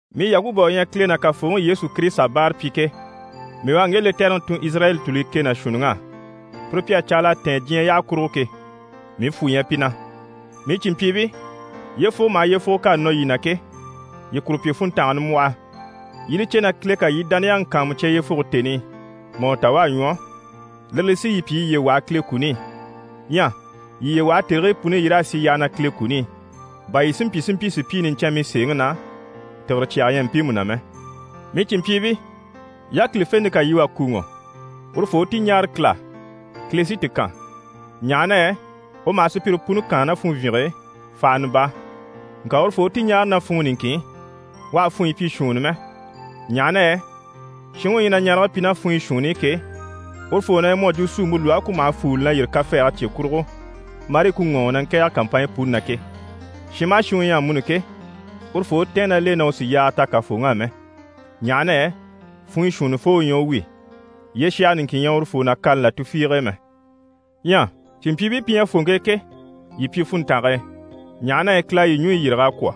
Mii Yakuba u ɲyɛ Kile ná Kafooŋi Yesu Kirisita báarapyi ke, mii u à ŋge lɛtɛrɛŋi tun Izirayɛli tùluyi kɛ ná shuunniŋ'á, pire pi à caala a tɛ̀ɛn diɲyɛ yyaha kurugo ke, mii fwù ɲyɛ pi na. Mii cìnmpyiibii, yyefugo maha yyefugo k'à nɔ yii na ke, yii kuru pyi funntanga nimbwɔhɔ. Yii i li cè na Kile ká yii dániyaŋi kàanmucya yyefuge tèni i mà u ta u à ɲwɔ, lire li sí yii pyi yii yiye waha Kile kuni i. Ɲyɛ yii yiye waha tèrigii puni i, yii raa sì yyaha na Kile kuni i, bà yii si mpyi si mpyi sùpyii niɲcɛnmii sèeŋi na, tìgire cyaga ɲyɛ mpiimu na mɛ. Mii cìnmpyiibii, yákilifente ká yii wà kùuŋɔ, urufoo u ti ɲáare Kile á. Kile sí ti kan, ɲaha na yɛ u maha sùpyire puni kaan ná funvyinge e fahana baa. Ŋka urufoo u ti ɲáare ná funŋɔ niŋkin i, u àha funɲyi pyi shuunni mɛ, ɲaha na yɛ shinŋi u ɲyɛ na ɲarege pyi ná funyɔ shuunni i ke, urufoo na ɲyɛ mu à jwo suumpe lwɔhe ku maha fuuli na yîri kafɛɛge cye kurugo, marii ku ŋɔɔŋi na ŋkɛ̀ɛge kàmpanɲyi puni na ke. Shin maha shin u ɲyɛ amuni ke, urufoo u tɛ̀ɛn ná l'e na u sì yaaga ta Kafooŋi á mɛ, ɲaha na yɛ funɲyishuunnifoo u ɲyɛ u wi, yyeshaga niŋkin ɲyɛ urufoo na kani là tufiige e mɛ. Ɲyɛ cìnmpyiibii pi ɲyɛ fòŋke e ke, yii pyi funntange e, ɲaha na yɛ Kile à yii ɲùɲyi yîrig'a kwɔ̀.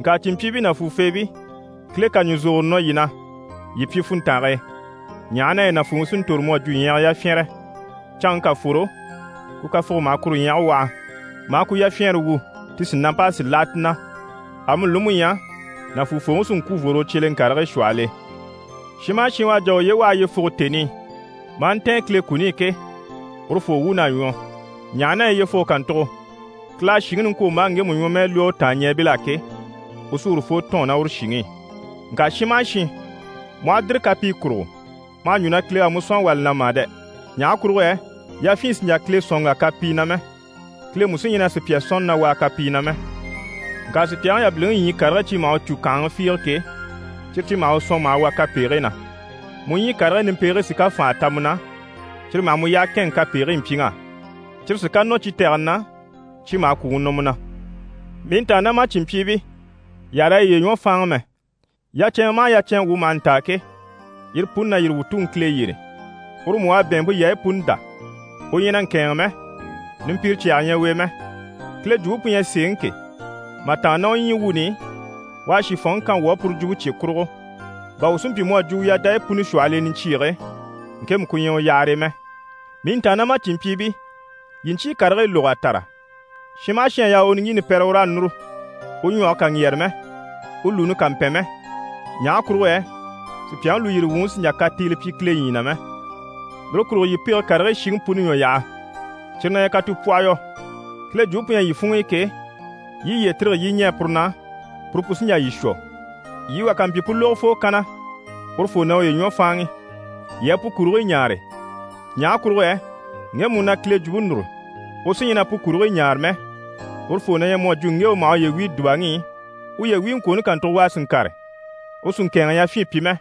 Ŋka cìnmpyiibii nàfuufeebii, Kile ká ɲùzogoro nɔ yii na, yii pyi funntange e, ɲaha na yɛ nàfuufooŋi sí n‑tòro mu à jwo ɲyɛgɛ yafyɛnrɛ. Canŋke ká fworo, ku kafuge maha kuru ɲyɛgɛ waha, maa ku yafyɛɛnre wu, ti sìnamp'a sì láha ti na. Amuni li mú ɲyɛ, nàfuufooŋi sí n‑kwû n‑fworo u cyeleŋkarigii shwɔhɔl'e. Shin maha shin u à jà a uye waha yyefuge tèni i, maa ntɛ̀ɛn Kile kuni i ke, urufoo wuun'à ɲwɔ, ɲaha na yɛ yyefuge kàntugo, Kile à shìŋi niŋkwombaaŋi ŋgemu ɲwɔmɛɛ lwɔ́ u tàanɲɛɛbil'á ke, u sí urufoo tɔ̂ɔn ná uru shìŋi i. Ŋka shin maha shin, mu aha dìri kapii kurugo, ma hà ɲjwo na Kile u à mu sɔ̀n a wà li na mà dɛ! Ɲaha kurugo yɛ yafyin sì n‑jà Kile sɔ̀n n‑wà kapii na mɛ. Kile mú sí ɲyɛ na sùpya sɔ̀nni na wàa kapii na mɛ. Ŋka sùpyaŋi yabiliŋi ɲyii karigii cyi maha u cû kànhaŋa fiige ke, cyire cyi maha u sɔ̀n maha wà kapegigii na. Mu ɲyii karigii nimpegigii sí ká fànha ta mu na, cyire maha mu yyaha kɛ̂ɛnŋɛ kapegigii mpyiŋ'á. Cyire sí ká nɔ cyi tɛgɛni na, cyi maha kwùŋi nɔ mu na. Mii ntàannamacinmpyiibii, yii àha raa yiye ɲwɔ fáanŋi mɛ. Yacɛnŋɛ maha yacɛnŋɛ wuu maha ntaa ke, yire puni na yîri wuu Tuŋi Kile yyére. Uru mú u à bɛ̀ɛnmpe yaayi puni dá, u ɲyɛ na ŋkɛ̂ɛnŋi mɛ, numpire cyaga ɲyɛ u e mɛ. Kile Jwumpe pu ɲyɛ sèeŋi ke, mà tàanna ná u ɲyii wuuni i, u à shìfɔnŋi kan wuu á puru jwumpe cye kurugo, bà wuu si mpyi si mpyi mu à jwo u yadayi puni shwɔhɔl'e niɲcyiige, ŋkemu ku ɲyɛ u yahare e mɛ. Mii ntàannamacinmpyiibii, yii ɲcyii karigii lóg'a tàra, shin maha shin à yaa u u niŋgyiini pɛ́rɛ, u raa núru, u ɲwɔge kà ŋgyɛ̀rɛ mɛ, u lùuni kà mpɛn mɛ. Ɲaha kurugo yɛ sùpyaŋi lùyiri wuŋi sì n‑jà katiile pyi Kile ɲyii na mɛ. Lire kurugo yii pege karigii shiŋi puni ɲwɔ yaha, cyire na ɲyɛ katupwɔhɔyɔ. Kile jwumpe pu ɲyɛ yii funŋ'i ke, yii yiye tîrige yii i ɲɛɛ puru na, puru pu sí n‑jà yii shwɔ. Yii wà ká mpyi pu lógofoo kanna, urufoo na uye ɲwɔ fáanŋi. Yii a pu kurigii ɲaare. Ɲaha kurugo yɛ ŋgemu u na Kile jwumpe núru, u sí ɲyɛ na pu kurigii ɲaare mɛ, urufoo na ɲyɛ mu à jwo ŋge u maha uye wíi dùbaŋi i, uye wíiŋkwooni kàntugo, u a sì ŋkàre, u sì ŋkɛ̀ɛnŋɛ yafyin pyi mɛ,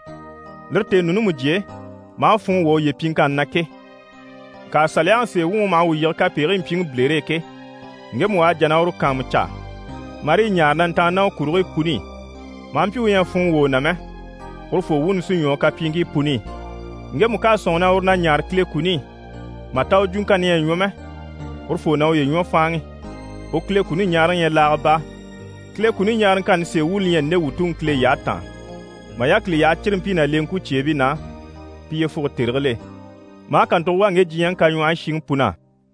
lire tèenuuni mujye e, maa funŋɔ wwɔ̀ uye pyiŋkanni na ke. Ŋka Saliyaŋi sèe wuŋi u maha wuu yige kapegigii mpyiŋi bilere e ke, ŋgemu u à jà na uru kàanmucaa, marii ɲaare na ntàanni ná u kurigii puni i, maa mpyi u ɲyɛ a funŋɔ wwɔ̀ u na mɛ, urufoo wuuni sí ɲwɔ u kapyiiŋkii puni i. Ŋgemu ká a sɔ̂nŋi na uru na ɲaare Kile kuni i, mà ta u jwuŋkanni ɲyɛ a ɲwɔ mɛ, urufoo na uye ɲwɔ fáanŋi, u Kile kuni ɲaaraŋi ɲyɛ laaga baa. Kile kuni ɲaaraŋkanni sèe wuuni li ɲyɛ nde wuu Tuŋi Kile yyaha taan: mà yákili yaha círimpii ná leŋkwucyeebii na, pi yyefuge tèrigil'e. Maa kàntugo wà ŋge diɲyɛŋi kaɲwɔhɔyi shiŋi pun'á.